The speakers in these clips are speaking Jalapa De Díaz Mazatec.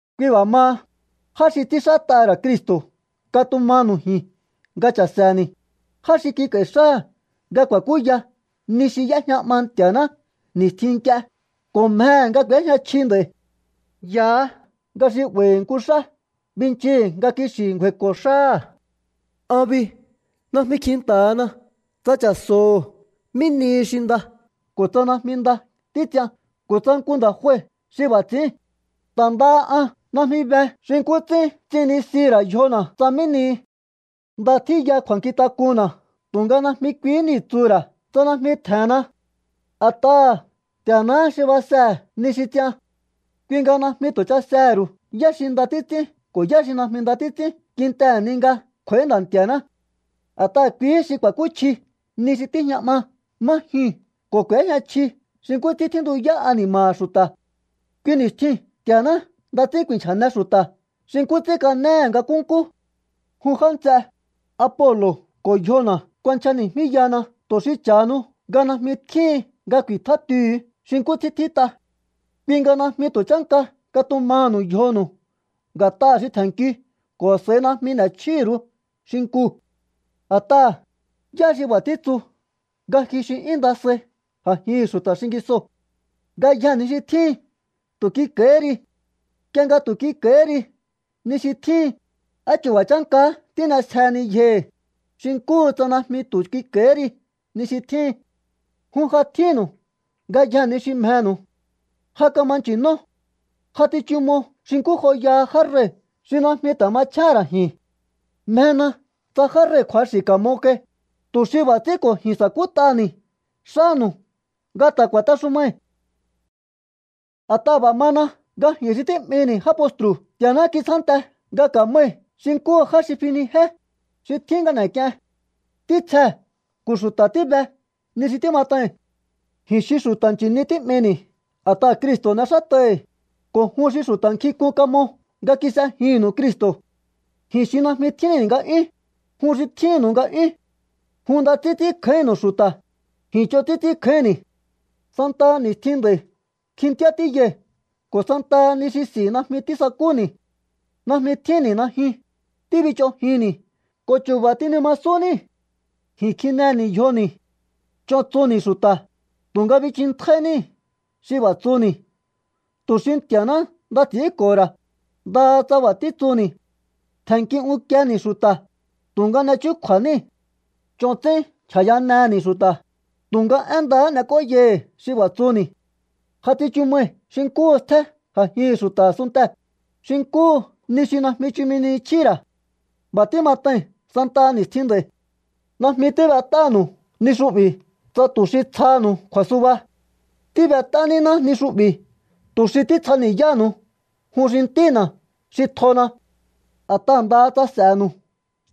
Kui b'a̱ maha, já xi ts'ínxát'aha̱ ra̱ Cristo̱ katumanu̱u ji̱n nga cha̱se̱ni̱, já xi kik'a̱i̱ xáha̱ nga ku̱a̱kúya ni xi y'éjña 'ma Nti̱a̱ná ni̱stjin nk'ie ko̱ mjehe̱ nga k'u̱éjña chji nd'a̱i̱. Yahá nga xi 'ba̱i̱hi̱ nku xá binchihi̱ nga kixi̱ ngju̱a̱i̱ko̱ xáha̱. An bi najmi kjinta̱hana tsa cha̱so̱ho̱ mí nihi xi nda ko̱ tsa najmi nda títs'ian ko̱ tsa nku nda̱ jue xi b'a̱ ts'i̱ín. Ta̱ ndaha an najmi be xi nkú ts'ín ts'innisihi̱ ra̱ yjona̱ tsa mí nihi. Nda tjíya kju̱a̱nkjintak'unna̱ tu̱nga najmi kuihí niu̱ tsuhu̱ ra̱ tsa najmi tje̱nna. A̱t'aha̱ Nti̱a̱náhá xi basehe̱ ni xi ts'ian. Kui nga najmi tu̱ chasehe̱ ru̱u yá xi nda títs'ín ko̱ yá xi najmi nda títs'ín kintehe̱ ni nga kj'u̱a̱í Nda̱ Nti̱a̱ná. A̱t'aha̱ kuihí xi ku̱a̱kúchji ni xi tíjña 'ma má jyuu̱n ko̱ k'u̱éjña chji xi nkú ts'ín tjíntuyá ani̱ma̱ha̱ xu̱ta̱. Kui ni̱stjiu̱n Nti̱a̱ná nda ts'ín ku̱i̱nchja̱ne xu̱ta̱ xi nkú ts'ín kanéhe̱ nga nkúnkú. Jun já nts'e, Apolo̱ ko̱ yjona̱ kuanchjani̱jmíyahana tu̱ xi cha̱hanu nga najmi tjíhin nga ku̱i̱tjátihu̱u xi nkú ts'ín tjít'a. Kui nga najmi tu̱ chánka katumaha̱nu̱u yjonu̱u nga̱t'aha̱ xi tje̱nnkiu ko̱ a̱s'a̱i najmi n'e̱chjíhi̱ ru̱u xinkuu̱. A̱t'aha̱, ¿yá xi b'a̱ títsu nga ji xi 'yún nda sai a̱jihi̱n xu̱ta̱ xingisoo̱? Ngayjee̱ ni xi tjíhin tu̱ kik'a̱i̱híri. Nk'ie nga tu̱ kik'a̱i̱hí ri ni xi tjíhin, ¿á chu̱ba̱ chánkahá tín'esjeheni yjohi̱, xi nkúhu tsa najmi tu̱ kik'a̱i̱hí ri ni xi tjíhin? Jun ja tjínnu̱u ngayjee̱ ni xi mjenu̱u. Ja kama nchi̱nó. Ja tsichumo xi nkú joyaha já rei̱ xi najmi ta̱ machjéhe̱n ra̱ ji̱n. Mjena tsa já rei̱ kju̱axi̱ ka̱mo kai, tu̱ xi b'a̱ ts'ín ko̱ ji̱n sa̱kút'aha̱ni̱ xánu̱u nga ta̱ ku̱a̱texumai̱. A̱t'aha̱ b'a̱ mana nga ji̱n xi tí'mini̱ já postru̱ Nti̱a̱ná kitsjánte nga kamai̱ xi nkúhu já xi finijé, xi tjín nga n'e̱k'ien. Ntítsjee̱ ko̱ xu̱ta̱ tíbe ni xi tímat'ai̱n. Ji̱n xi xu̱ta̱ chi̱ni tí'mini̱ a̱t'aha̱ Cristo̱ n'exát'ai̱hi̱, ko̱ jun xi xu̱ta̱ nkjink'un kamo nga kis'ejinnu̱u Cristo̱. Ji̱n xi najmi tjínni̱ nga'yún, jun xi tjínnu̱u nga'yún. Jun nda ts'ín ts'ínkjáínnu̱u xu̱ta̱, ji̱n ch'on ts'ín ts'ínkjáínni̱. Santaha ni̱stjin nd'a̱i̱ kjintjíá tíyai̱ ko̱ santaha ni xi s'i̱ najmi tísakúni̱. Najmi tjínni̱ najyun, tíbich'onjinni̱ ko̱ chu̱ba̱ tinimasún níi̱. Ji̱n kjineni̱ yjoni̱. Ch'on tsuni̱ xu̱ta̱, tu̱nga binchintjáí níi̱ xi b'a̱ tsuni̱ tu̱ xi Nti̱a̱ná nda ts'i̱ínko̱ho̱ ra̱, ndaha tsa b'a̱ títsuni̱. Tje̱nnki unkieni̱ xu̱ta̱, tu̱nga n'e chúkju̱a̱ níi̱. Ch'on ts'ín nchja̱yaneni̱ xu̱ta̱, tu̱nga én ndahá n'ek'óyai̱hi̱ xi b'a̱ tsuni̱. Ja tsichu mai̱ xi nkúhu stjé a̱jihi̱n xu̱ta̱ a̱sunntee̱, xi nkúhu ni xi najmi chumi ni chjíhi̱ ra̱. B'a̱ tímat'ai̱n santaha ni̱stjin nd'a̱i̱. Najmi tíb'et'ánu̱u ni xu'bi̱ tsa tu̱ xi tsjaha̱nu̱u kju̱a̱suba. Tíb'et'á níná ni xu'bi̱ tu̱ xi títsjani̱yáha̱nu̱u jun xi ntína̱ xi tjona. A̱t'aha̱ ndaha tsa s'e̱nu̱u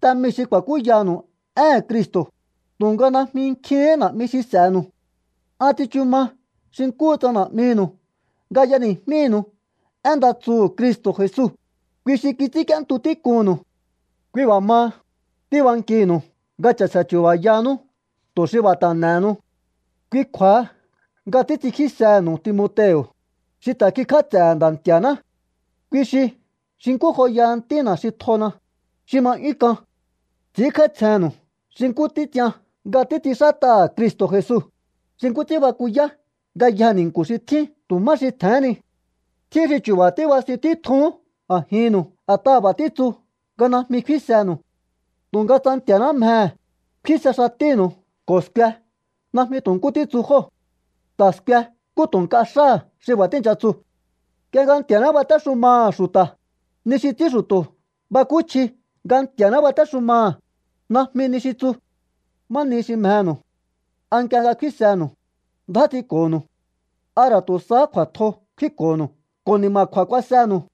te mii̱ xi ku̱a̱kúyanu̱u éhe̱n Cristo̱, tu̱nga najmi nkjihín na̱'mi xi s'e̱nu̱u. An tsichu ma xi nkúhu tsa na̱'minu̱u nga y'eni̱jmínu̱u én nda tsuhu̱ Cristo̱ Jesu, kui xi kits'ínk'íéntu tík'unnu̱u. Kui b'a̱ maha, tíbankihi̱nu̱u nga cha̱se̱ chu̱ba̱yahanú tu̱ xi b'a̱ ta̱ n'e̱henu. Kui kju̱a̱ha nga títs'inkjísehe̱nu̱u Timoteo̱, xi ta̱ kikj'áts'e̱he̱ Nda̱ Nti̱a̱ná. Kui xi xi nkú joyaha ntína̱ xi tjona, xi ma 'yún k'an. Ts'i̱ínkj'áítsjennu̱u xi nkú títs'ian nga títs'inxát'aha̱ Cristo̱ Jesu, xi nkú ts'ín bakuyá ngayjee̱ ni̱nku̱ xi tjín tu̱ má xi tje̱hén ni. Tjín xi chu̱ba̱ tíbasin títjuhún a̱jinnu̱u a̱t'aha̱ b'a̱ títsu nga najmi kfínsenu̱u. Tu̱nga tsa Nti̱a̱ná mjehe̱, kfínse xatínu̱u ko̱ skue najmi tu̱ nkú títsu jóo̱. Ta̱ skue nkú tu̱ nk'a xáha̱ xi b'a̱ tíi̱ncha tsu. Nk'ie nga Nti̱a̱ná batéxumaha̱ xu̱ta̱, ni xi ts'ín xu̱to̱ bakúchji nga Nti̱a̱ná batéxumaha̱, najmi ni xi tsu. ¿Má nihi xi mjenu̱u? ¿A nk'ie nga kfínsenu̱u, ndjá ts'inko̱nu̱u? ¿A ra̱ tu̱ sahá kju̱a̱tjo kfínko̱nu̱u ko̱ ni̱ma̱kju̱a̱ kuasenu̱u?